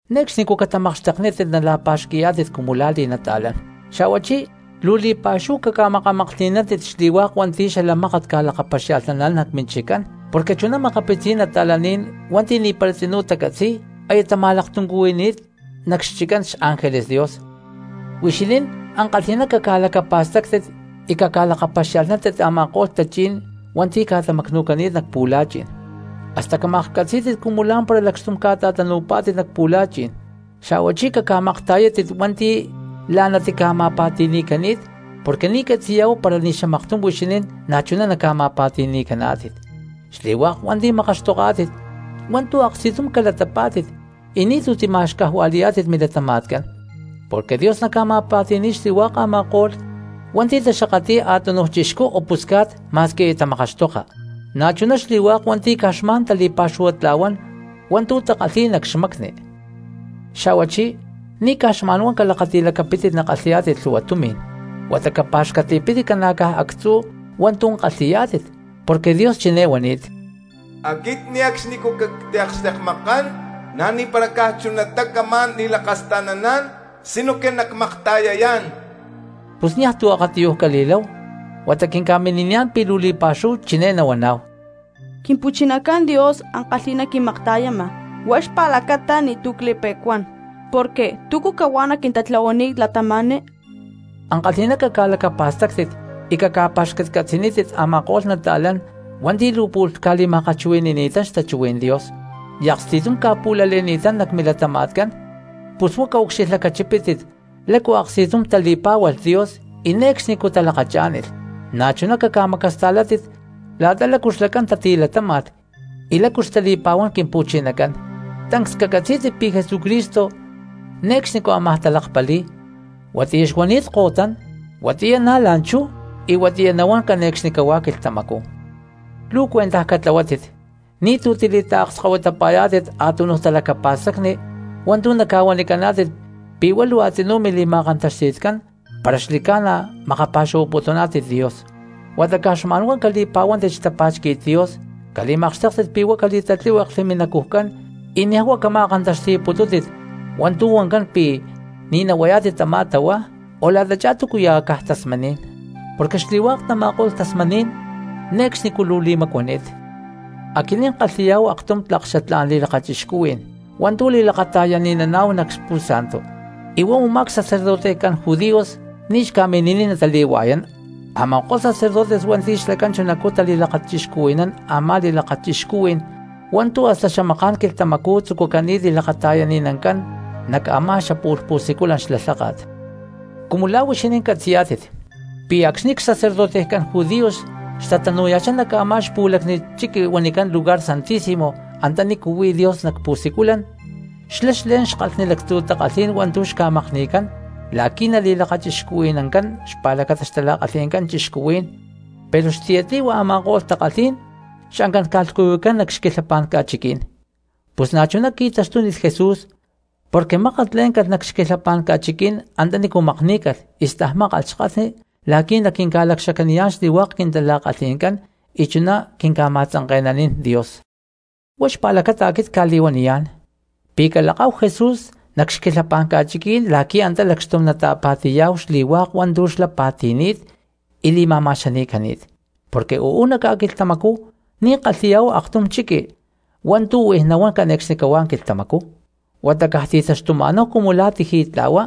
Ne̠cxnicú catamakxteknítit nala̠pa̠xqui̠yá̠tit cumu lá li̠nata̠lán. Xa̠huachí luu li̠pa̠xúhu caca̠makamaklhti̠nántit xli̠hua̠k hua̠nti̠ xala mákat ca̠lakapaxia̠lhnaná̠n nac minchiccán porque chuná makapitzí̠n cristianos hua̠nti̠ ni̠para tzinú tacatzi̠y aya tama̠laktuncuhui̠ni̠t nac xchiccán xángeles Dios. Huixinín ankalhi̠ná caca̠lacapa̠stáctit y caca̠lakapaxia̠lhnántit a̠ma̠ko̠lh tachí̠n hua̠nti̠ ca̠tamacnu̠cani̠t nac pu̠la̠chi̠n, hasta camaklhcatzí̠tit cumu lá̠mpara lacxtum ca̠ta̠tanu̠pá̠tit nac pu̠la̠chi̠n, xa̠huachí caca̠makta̠yátit hua̠nti̠ la̠ná tica̠ma̠pa̠ti̠ni̠cani̠t porque ni̠ catzi̠yá̠hu para ni̠ xamaktum huixinín na̠chuná naca̠ma̠pa̠ti̠ni̠caná̠tit. Xli̠hua̠k hua̠nti̠ makaxtoká̠tit, hua̠ntu̠ aksti̠tum calatapá̠tit y ni̠tu̠ tima̠xcajua̠li̠yá̠tit milatama̠tcán porque Dios naca̠ma̠pa̠ti̠ni̠y xli̠hua̠k a̠ma̠ko̠lh hua̠nti̠ taxakatli̠y a̠túnuj cristianos ma̠squi aya tamakaxtoka, na̠chuná xli̠hua̠k hua̠nti̠ caj xma̠n tali̠pa̠xuhua̠na̠tla̠huán hua̠ntu̠ takalhi̠y nac xmacni. Xa̠huachí ni̠ caj xma̠n huá calakati̠lacapítit nakalhi̠yá̠tit lhu̠hua tumi̠n, huata capa̠xcatli̠pítit ca̠na̠caj actzú hua̠ntu̠ kalhi̠yá̠tit, porque Dios chiné huani̠t: “Aquit ne̠cxnicú cactiakxtekmakán, na̠ ni̠para caj chunatá camá̠n li̠lakasta̠naná̠n sinoque nacmakta̠yayá̠n.” Pus niaj tu̠ akatiyuj cali̠láhu huata quinca̠mini̠niyá̠n pi̠ luu li̠pa̠xúhu chiné nahuaná̠hu: Quimpu̠chinacán Dios ankalhi̠ná quimakta̠yama, huá xpa̠lacata ni̠tu̠ cli̠pe̠cuán, porque ¿tícu cahuá naquintatlahuaniy cristianos? Ankalhi̠ná caca̠lacapa̠stáctit y caca̠pa̠xcatcatzi̠nítit a̠ma̠ko̠lh cristianos hua̠nti̠ luu pu̠lh ca̠liakchuhui̠nanini̠tán xtachuhuí̠n Dios y aksti̠tum ca̠pu̠lale̠ni̠tán nac milatama̠tcán. Pus huá caucxilhlacachipítit lácu aksti̠tum tali̠pá̠hualh Dios y ne̠cxnicú talakachá̠nilh, na̠chuná caca̠macasta̠látit la̠ta lácu xlacán tatilatáma̠lh y lácu xtali̠pa̠huán Quimpu̠chinacán. Tancs cacatzí̠tit pi̠ Jesucristo ne̠cxnicú ámaj talakpali̠y, huatiyá xuani̠t ko̠tán, huatiyá na̠ la̠nchú, y huatiyá nahuán cane̠cxnicahuá quilhtamacú. Luu cuentaj catlahuátit ni̠tu̠ tili̠taakskahuitapa̠yá̠tit a̠túnuj talacapa̠stacni hua̠ntu̠ naca̠huanicaná̠tit pi̠ huá luu a̠tzinú mili̠ma̠kantaxti̠tcán para xli̠ca̠na makapa̠xuhuaputuná̠tit Dios, huata caj xma̠n huá cali̠pa̠huántit xtapá̠xqui̠t Dios, cali̠makxtéktit pi̠ huá cali̠tatlíhueklhli minacujcán, y niaj huá cama̠kantaxti̠putútit hua̠ntu̠ huancán pi̠ “ni̠ nahuayá̠tit tamá tahuá”, o la̠tachá túcuya̠ caj tasmaní̠n, porque xli̠hua̠k tama̠ko̠lh tasmaní̠n ne̠cxnicú luu li̠macuani̠t. Aquinín kalhi̠yá̠hu aktum tlak xatlá̠n li̠lakachixcuhuí̠n hua̠ntu̠ li̠lakata̠yani̠naná̠hu nac altar y huá a̠má xli̠ca̠na pi̠ ni̠ xcurajcán judíos hua̠nti̠ ca̠mini̠niy natali̠hua̠yán a̠ma̠ko̠lh xcurajcán judíos hua̠nti̠ xlacán chunacú tali̠lakata̠yani̠nán a̠ma̠ko̠lh li̠lakachixcuhuí̠n hua̠ntu̠ hasta xamaká̠n quilhtamacú tzucucani̠t li̠lakata̠yani̠nancán nac a̠má xapu̠lh pu̠siculan xla lháka̠t. Cumu la̠ huixinín catzi̠yá̠tit pi̠ acxni̠ xapuxcu cura xtanu̠ya̠chá nac a̠má xli̠pu̠lactiy chiqui huanicán Lugar Santísimo antanícu huí Dios nac pu̠siculan, xlá xle̠n xkalhnicán lactzu̠ takalhí̠n hua̠ntu̠ xca̠makni̠cán la̠quí nali̠lakachixcuhui̠nancán xpa̠lacata xtala̠kalhi̠ncán cristianos, pero xtiyatli̠hua a̠ma̠ko̠lh takalhí̠n xancán ca̠lhcuyucán nac xquilhapá̠n ca̠chiquí̠n. Pus na̠chuná qui̠taxtúnilh Jesús, porque mákat lé̠ncalh nac xquilhapá̠n ca̠chiquí̠n antanícu makní̠calh y stajmákalh xkalhni la̠qui̠ naquinca̠li̠lacxacaniyá̠n xli̠hua̠k quintala̠kalhí̠ncán y chuná quinca̠ma̠tzanke̠nanín Dios. Huá xpa̠lacata aquit cca̠li̠huaniyá̠n pi̠ calakáhu Jesús nac xquilhapá̠n ca̠chiquí̠n la̠qui̠ antá lacxtum nata̠pa̠ti̠yá̠hu xli̠hua̠k hua̠ntu̠ xlá pa̠ti̠ni̠t y li̠ma̠ma̠xani̠cani̠t. Porque uú nac ca̠quilhtamacú ni̠ kalhi̠yá̠hu aktum ca̠chiquí̠n hua̠ntu̠ huij nahuán cane̠cxnicahuá quilhtamacú, huata caj ti̠taxtuma̠náhu cumu la̠ tiji̠tla̠hua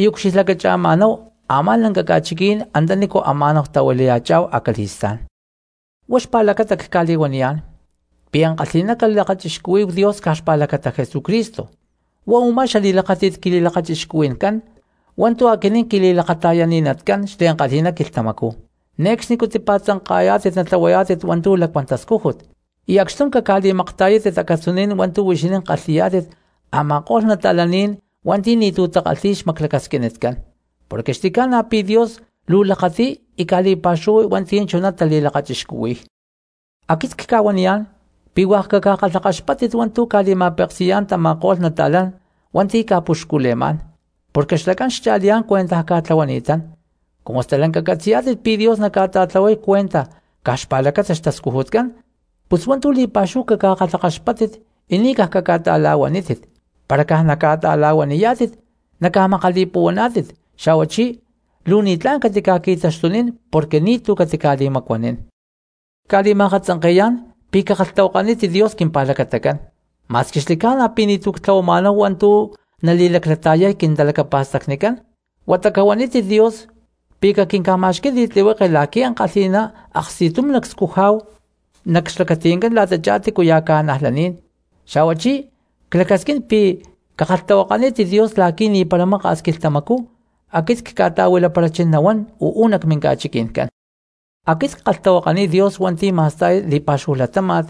y ucxilhlacacha̠ma̠náhu a̠má lanca ca̠chiquí̠n antanícu ama̠náhu tahuilaya̠chá̠hu acali̠stá̠n. Huá xpa̠lacata cca̠li̠huaniyá̠n pi̠ ankalhi̠ná calakachixcuhuí̠hu Dios caj xpa̠lacata Jesucristo, huá u̠má xatama̠akxtakajní̠n quili̠lakachixcuhui̠ncán hua̠ntu̠ aquinín quili̠lakata̠yani̠natcán xliankalhi̠ná quilhtamacú. Ne̠cxnicú tipa̠tzanka̠yá̠tit natlahuayá̠tit hua̠ntu̠ lacuán tascújut, y acxtum caca̠li̠makta̠yátit acatzuní̠n hua̠ntu̠ huixinín kalhi̠yá̠tit a̠ma̠ko̠lh cristianos hua̠nti̠ ni̠tu̠ takalhi̠y xmaclacasquinitcán, porque xli̠ca̠na pi̠ Dios luu lakati̠y y ca̠li̠pa̠xuhuay hua̠nti̠ chuná tali̠lakachixcuhui̠y. Aquit cca̠huaniyá̠n pi̠ hua̠k caca̠kalhakaxpáttit hua̠ntu̠ ca̠li̠ma̠peksi̠yá̠n tama̠ko̠lh cristianos hua̠nti̠ ca̠puxcule̠má̠n, porque xlacán xcha̠liyá̠n cuentaj ca̠tlahuani̠tán, cumu stalanca tacatzi̠y pi̠ Dios naca̠ta̠tlahuay cuentaj caj xpa̠lacata xtascujutcán. Pus hua̠ntu̠ li̠pa̠xúhu caca̠kalhakaxpáttit y ni̠ caj caca̠ta̠la̠huanítit; para caj naca̠ta̠la̠huaniyá̠tit naca̠makali̠puhuaná̠tit, xa̠huachí luu ni̠tlá̠n catica̠qui̠taxtunín porque ni̠tu̠ catica̠li̠macuanín. Cca̠li̠ma̠katzanke̠yá̠n pi̠ cakalhtahuakanítit Dios quimpa̠lacatacán, ma̠squi xli̠ca̠na pi̠ ni̠tu̠ ctlahuama̠náhu hua̠ntu̠ nali̠laclata̠yay quintalacapa̠stacnicán huata cahuanítit Dios pi̠ caquinca̠ma̠xquí̠n li̠tlihueke la̠qui̠ ankalhi̠ná aksti̠tum nacscujá̠hu nac xlacati̠ncán la̠tachá tícuya̠ cristianos. Xa̠huachí clacasquín pi̠ cakalhtahuakanítit Dios la̠qui̠ ni̠para maka̠s quilhtamacú aquit cca̠ta̠huilaparachín nahuán uú nac minca̠chiqui̠ncán. Aquit ckalhtahuakaniy Dios hua̠nti̠ ma̠sta̠y li̠pa̠xúhu latáma̠t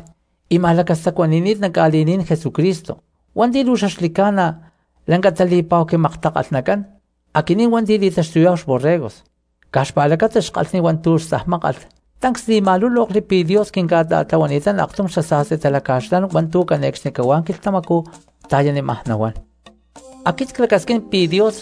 y ma̠lacastacuani̠ni̠t nac ca̠li̠ní̠n Jesucristo hua̠nti̠ luu xaxli̠ca̠na lanca tali̠pa̠hu quimaktakalhnacán aquinín hua̠nti̠ li̠taxtuyá̠hu xborregos, caj xpa̠lacata xkalhni hua̠ntu̠ stajmákalh tancs li̠ma̠lúlokli pi̠ Dios quinca̠ta̠tlahuani̠tán aktum xasa̠sti talaca̠xlán hua̠ntu̠ cane̠cxnicahuá quilhtamacú ta̠yanímaj nahuán. Aquit clacasquín pi̠ Dios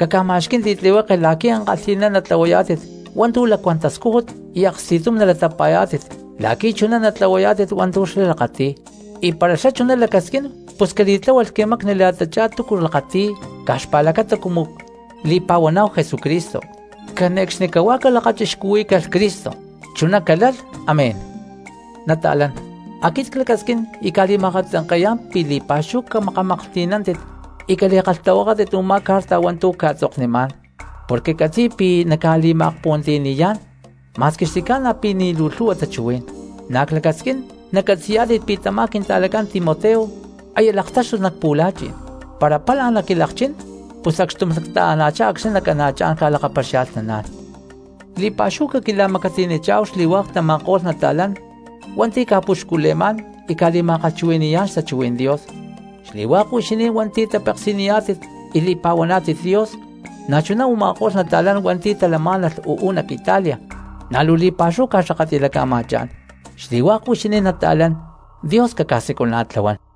caca̠ma̠xquí̠n li̠tlihueke la̠qui̠ ankalhi̠ná natlahuayá̠tit hua̠ntu̠ lacuán tascújut y aksti̠tum nalatapa̠yá̠tit la̠qui̠ chuná natlahuayá̠tit hua̠ntu̠ xlá lakati̠y; y para xlá chuná lacasquín pus cali̠tláhualh quimacnicán la̠ta túcu lakati̠y caj xpa̠lacata cumu li̠pa̠huaná̠hu Jesucristo. ¡Cane̠cxnicahuá calakachixcuhuí̠calh Cristo! Chuná calalh, amén. Nata̠lán, aquit clacasquín y cca̠li̠ma̠akatzanke̠yá̠n pi̠ li̠pa̠xúhu camakamaklhti̠nántit y cali̠kalhtahuakátit u̠má carta hua̠ntu̠ cca̠tzoknimá̠n porque ccatzi̠y pi̠ nacca̠li̠ma̠akpuhuantiyani̠yá̠n ma̠squi xli̠ca̠na pi̠ ni̠ luu lhu̠hua tachuhuí̠n. Na̠ clacasquín nacatzi̠yá̠tit pi̠ tamá quinta̠lacán Timoteo aya laktáxtulh nac pu̠la̠chi̠n; para pála naquilakchín pus acxtum nacta̠ana̠chá acxni̠ nacana̠chá̠n ca̠lakapaxialhnaná̠n. Li̠pa̠xúhu caquila̠macatiyanichá̠hu xli̠hua̠k tama̠ko̠lh nata̠lán hua̠nti̠ ca̠puxcule̠má̠n y ca̠li̠ma̠kalhchuhui̠ni̠yá̠n xtachuhuí̠n Dios xli̠hua̠k huixinín hua̠nti̠ tapeksi̠niyá̠tit y li̠pa̠huaná̠tit Dios. Na̠chuná u̠ma̠ko̠lh nata̠lán hua̠nti̠ talamá̠nalh uú nac Italia na̠ luu li̠pa̠xúhu ca̠xakatli̠laca̠ma̠chá̠n. Xli̠hua̠k huixinín nata̠lán, Dios caca̠siculana̠tlahuán.